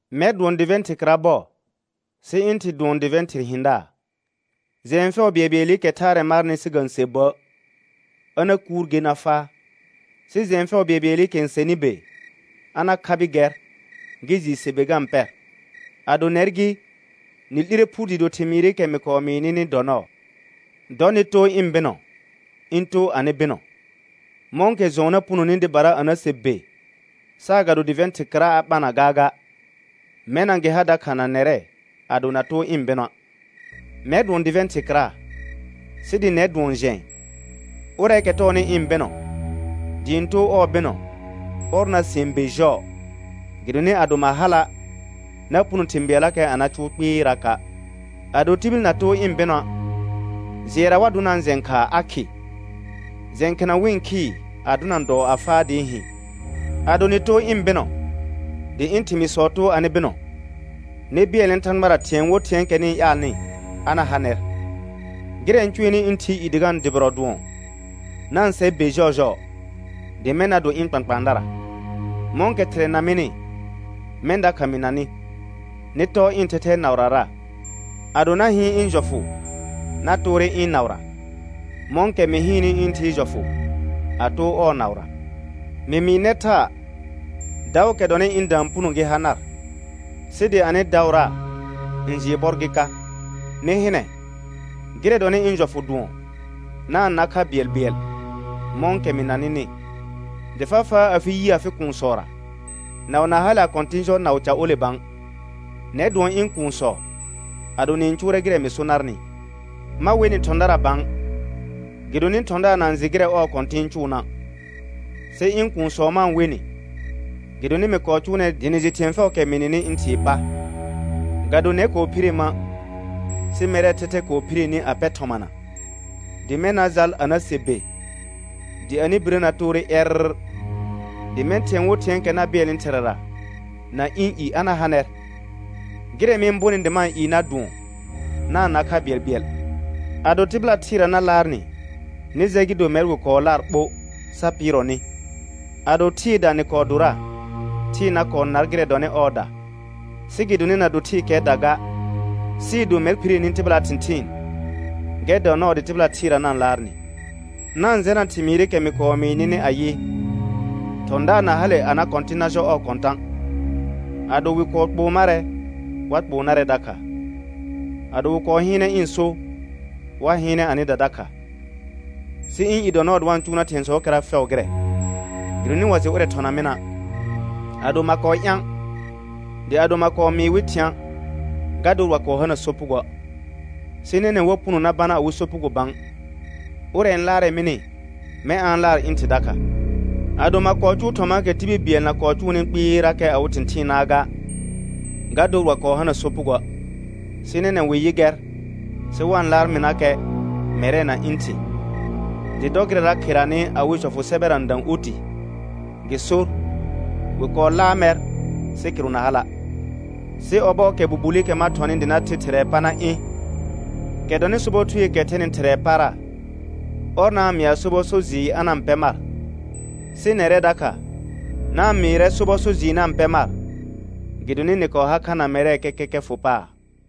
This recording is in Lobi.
Mɛr dʋɔn dɩvɛ̃ thɩr kɩra bɔ, sɩ ɩ̃ Thɩ dʋɔn dɩvɛ̃ thɩr hɩ̃daar. Jɛ̃ɛ fɛʋ bɩɛlbɩɛlɩkɛ thaarɛ marnɩ sɩ ga-n se bə', a na kuur ger na faa. Sɩ jɛ̃ɛ fɛʋ bɩɛlbɩɛlɩkɛ n sɛnɩ be, a na khabɩ gɛr gɩ jɩɩ se be ga-n pɛr. Ado nɛr gɩ, nɩ 'lire phur dɩɩ do thɩmɩɩrɩkɛ mɩ kɔɔ mɩɩ nɩnɩ dɔ nɔɔ. Dɔ nɩ too ɩ̃ bɩnɔ ɩ̃ too anɩ bɩnɔ. Mɔ̃kɛ jɔ̃ɔ na punoni dɩbara a na se be, saagado dɩvɛ̃ thɩr kɩra a ɓana gaaga, mɛna gɩ ha dakha na nɛrɛ ado na too ɩ̃ bɩnɔa'. Mɛr dʋɔn dɩvɛ̃ thɩr kɩra, sɩ dɩ nɛr dʋɔn jɛ̃ɛ. Ʋrɛɛkɛ tɔɔnɩ ɩ̃ bɩnɔ dɩ ɩ̃ too ɔɔ bɩnɔ, ɔr na sɩɛn be jɔɔ, gɩdonɩ ado ma hala' na puno thɩ̃ bɩɛllakɛ a na cʋʋ kpɩɩraka'. Ado tibil na too ɩ̃ bɩnɔa', jɩɛra wa dʋnaa jɛ̃ khaa a khɩ; jɛ̃ khɩna wɩ-n khɩɩ, a dʋna dɔɔ a faa dɩɩ hɩ̃. Ado nɩ too ɩ̃ bɩnɔ dɩ ɩ̃ thɩmɩɩsɔ too anɩ bɩnɔ, nɩ bɩɛlnɛ Thãgbara thɩ̃ɛ wo thɩ̃ɛɛkɛ nɩ-n ƴaalnɩ, a na ha nɛr. Gɩrɛ n cʋɛnɩ ɩ̃ Thɩɩ i dɩ ga-n dʋbɩrɔ dʋɔn: Na-n se be jɔɔjɔɔ dɩ mɛ̃ na do ɩ̃ kpãkpãadara. Mɔ̃kɛ Thɩrɛ na mɩnɩ, mɛ̃ dakha mɩ na nɩ. Nɩ tɔɔ ɩ̃ thɛthɛɛ naʋrara. Ado na hɩɩn ɩ̃ jɔfʋ na toore ɩ̃ naʋra, mɔ̃kɛ mɩ hɩɩnnɩ ɩ̃ Thɩɩ jɔfʋ a too ɔɔ naʋra. Mɩ mɩɩ nɛr thaa, daʋʋkɛ dɔnɩ ɩ̃da n puno gɩ ha nar, sɩ dɩ anɩ daʋra n jɩɩ bɔr gɩ ka. Nɩ hɩnɛ, gɩrɛ dɔnɩ ɩ̃ jɔfʋ dʋɔn: Na-n na kha bɩɛlbɩɛl mɔ̃kɛ mɩ na nɩnɩ. Dɩ fa faa afɩ yi afɩ kuunsɔra, naʋ na hale a kɔ̃tɩ̃ jɔ naʋ ca ole bã. Nɛr dʋɔn ɩ̃ kuunsɔ ado nɩ-n cʋʋrɛ gɩrɛ mɩ so narnɩ. Ma we nɩ thɔ̃dara bã, gɩdonɩ thɔ̃daar na-n jɩ gɩrɛ ɔɔ kɔ̃tɩ̃ n cʋʋna'. Sɩ ɩ̃ kuunsɔ ma-n we nɩ, gɩdonɩ mɩ kɔɔ cʋʋ nɛr dɩ nɩ jɩ thɩ̃ɛ fɛʋʋkɛ mɩ nɩnɩ ɩ̃ Thɩɩ pa. Ga do nɛr kɔɔ phire ma', sɩ mɛrɛɛ thɛthɛ kɔɔ phire ni a pɛ thɔmana, dɩ mɛ̃ na jal a na se be, dɩ anɩ birə na toore ƴɛrr, dɩ mɛ̃ thɩ̃ɛ wo thɩ̃ɛɛkɛ na bɩɛlnɩ Thɩrɛra na ɩ̃ i a na ha nɛr. Gɩrɛ mɩ-n bonɩ ma-n ɩɩ nar dʋɔn, na-n na kha bɩɛlbɩɛl. Ado tɩbɩla thɩɩra na laar nɩ, nɩ jɛ gɩ do mɛr wɩ kɔɔ laar ɓo sa pɩɩrɔ nɩ. Ado thɩɩda nɩ kɔɔ dora, thɩɩ na kɔɔ nar gɩrɛ dɔnɩ ɔɔda. Sɩ gɩdonɩ na do thɩɩkɛɛda ga, sɩɩ do mɛr phire ni tɩbɩlaa thɩ̃thɩɩn, gɛr dɔ nɔɔ dɩ tɩbɩla thɩɩra na-n laar nɩ. Na-n jɛna thɩmɩɩrɩkɛ mɩ kɔɔ mɩɩ nɩnɩ ayɩ: Thɔ̃daar na hale a na kɔ̃tɩ̃ na jɔ ɔɔ kɔ̃tã'. Ado wɩ kɔɔ kpoo marɛ, wa kpoo narɛ dakha. Ado wɩ kɔɔ hɩɩnɛ ɩ̃ so, wa hɩɩnɛ anɩda dakha. Sɩ ɩ̃ i dɔ nɔɔ dɩ wa-n cʋʋ nar thɩ̃ɛsɔɔkɛra fɛʋ gɩrɛ, gɩdonɩ wa jɩ ʋrɛ thɔna mɩna'. Ado ma kɔɔ ɩ̃a', dɩ ado ma kɔɔ mɩɩ wɩ thɩ̃a', ga dor wa kɔɔ hana sopugoə'. Sɩ nɛnɛ̃ wa puno na bana awɩ sopugo bã. Ʋrɛ n laarɛ mɩnɩ, mɛ̃ a-n laar ɩ̃ Thɩ dakha. Ado ma kɔɔ cʋʋ thɔmaakɛ tibil bɩɛl na kɔɔ cʋʋnɩ kpɩɩrakɛ awɩ thɩ̃thɩɩnaa ga, ga dor wa kɔɔ hana sopugoə'. Sɩ nɛnɛ̃ wɩ yɩ gɛr, sɩ wa-n laar mɩnakɛ, mɛrɛ na ɩ̃ Thɩ. Dɩ dɔ gɩrɛra kheranɩ awɩ jɔfʋ sɛbɛra n dã oti, gɩ sor: «Wɩ kɔɔ laar mɛr, sɩ kɩrʋ na hala'.» Sɩ ɔbɔɔkɛ Bubulikɛ ma thɔnɩ dɩ na the Thɩrɛɛ pa na ɩ̃, kɛ dɔnɩ sobɔ Thueekɛ thɛnɩ Thɩrɛɛ para, ɔr na-n mɩa sobɔ so jɩɩr a na-n pɛ mar. Sɩ nɛrɛ dakha, na-n mɩɩrɛ sobɔ so jɩɩr na-n pɛ mar, gɩdonɩ nɩ kɔɔ har kha na mɛrɛ kɛkɛkɛ fʋ paar.